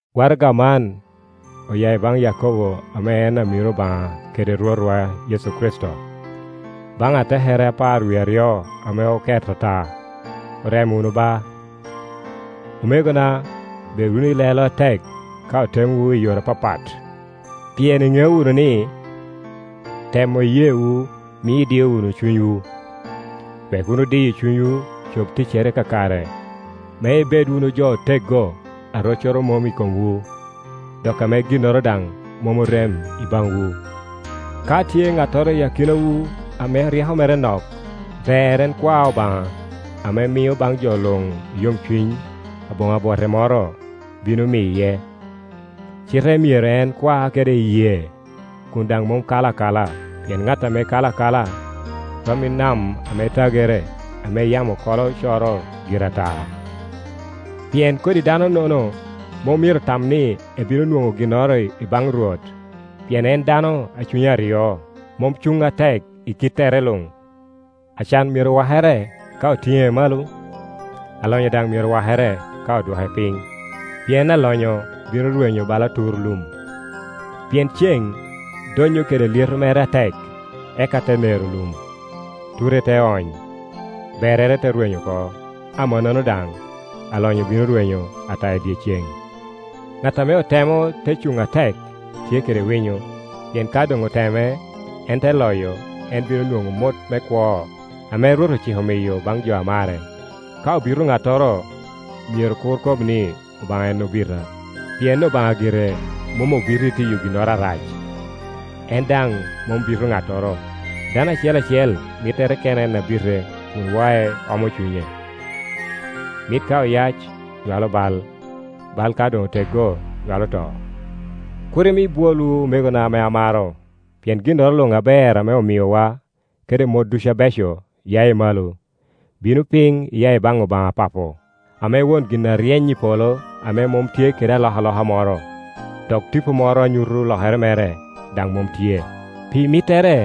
Waraga man oya i baŋ Yakobo ame en amiro Obaŋa kede Rwotwa Yecu Kricito. Baŋ atekere apar wie aryo ame oket ata: Orem wunu ba. Omegona, bed wunu i lelo atek ka otemowu i yore apapat, pien iŋeo wunu ni, temo iyeewu mio idio wunu cunywu. Wek wunu diyo cunywu cob ticcere kakare, me ibed wunu jo oteggo, a roccoro mom i komwu, dok ame ginnoro daŋ mom orem i baŋwu. Ka tye ŋattoro i akinawu ame ryeko mere nok, ber en kwa Obaŋa ame mio baŋ jo luŋ i yomcuny, aboŋo abwote moro; bino miye. Cite myero en kwa kede iyee, kun daŋ mom kala akala; pien ŋat ame kala akala, rom i nam ame tagere, ame yamo kolo coro gire atata. Pien kodi danonono mom myero tam ni ebino nwoŋo ginnoro i baŋ Rwot, pien en dano a cunye aryo, mom cuŋ atek i kittere luŋ. Acan myero wakere ka otiŋe malo, alonyo daŋ myero wakere ka odwoke piny; pien alonyo bino rwenyo bala tur lum. Pien ceŋ donnyo kede lyeto mere atek, eka te nero lum, ture te ony, berrere te rwenyo oko. Amannono daŋ, alonyo bino rwenyo ata i dyeceŋ. Ŋat ame otemo te cuŋ atek, tye kede winyo; pien ka doŋ oteme, en te loyo, en bino nwoŋo mot me kwo ame Rwot ociko miyo baŋ jo a mare. Ka obito ŋattoro, myero kur kob ni, “Obaŋa en obita”, pien Obaŋa gire mom obito i tiyo ginnoro arac, en daŋ mom bito ŋattoro. Dano acel acel mittere kene en abite, kun wae, omo cunye. Mit ka oyac nywalo bal. Bal ka doŋ oteggo, nywalo to. Kur imi bwolwu, omegona ame amaro. Pien ginnoro luŋ aber ame omiowa, kede mot ducu abeco, ya i malo, bino piny iya i baŋ Obaŋa Papo, ame won gin aryeny i polo, ame mom tye kede alokaloka moro, dok tipo moro a nyuto lokere mere daŋ mom tye. Pi mittere,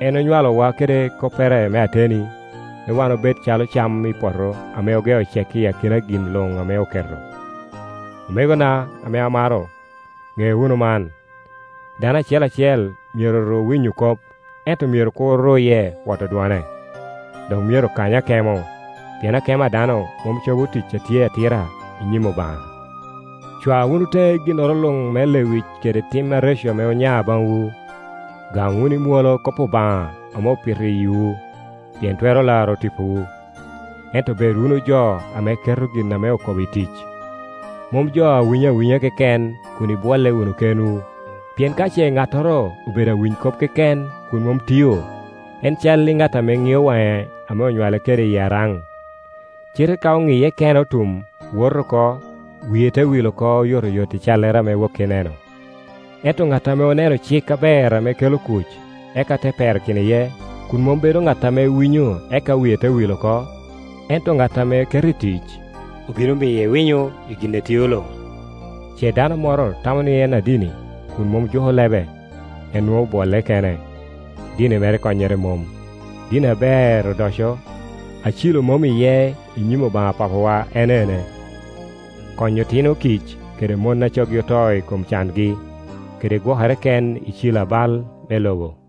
en onywalowa kede koppere me ateni, me wan obed calo cam i poto ame ogeo cek i kin gin luŋ ame oketo. Omegona ame amaro, ŋe wunu man. Dano acel acel myero ru winyo kop, ento myero kur ruye woto dwone, dok myero kany akemo. Pien akemo a dano mom cobo tic a tye atira i nyim Obaŋa. Cwa wunu teŋe ginnoro luŋ me lewic kede tim areco ame onya baŋwu, gam wunu i mwolo kop Obaŋa ame opito i yiwu, pien twero laro tipowu. Ento bed wunu jo ame keto gin ame okobo i tic, mom jo a winyo awinya keken kun ibwolle wunu kenwu. Pien ka ce ŋattoro obedo awiny kop keken kun mom tio, en cal i ŋat ame ŋio waŋe ame onywale kede iyi araŋ. Cite ka oŋiye kene otum, woto oko, wie te wil oko oyotoyot i callere ame woki eneno. Ento ŋat ame oneno cik aber ame kelo kuc, eka te perakino iye, kun mom bedo ŋat ame winyo eka wie te wil oko, ento ŋat ame keto i tic, obino miye winyo i gin etio luŋ. Ce dano moro tamo ni en adini kun mom juko lebe, en nwoŋo obwolle kene, dini mere konyere mom. Dini aber odoco, a cilo mom iye i nyim Obaŋa Papawa en ene: konyo otino kic kede mon a coggi oto i kom cangi, kede gwokere ken i ci lo a bal me Iobo.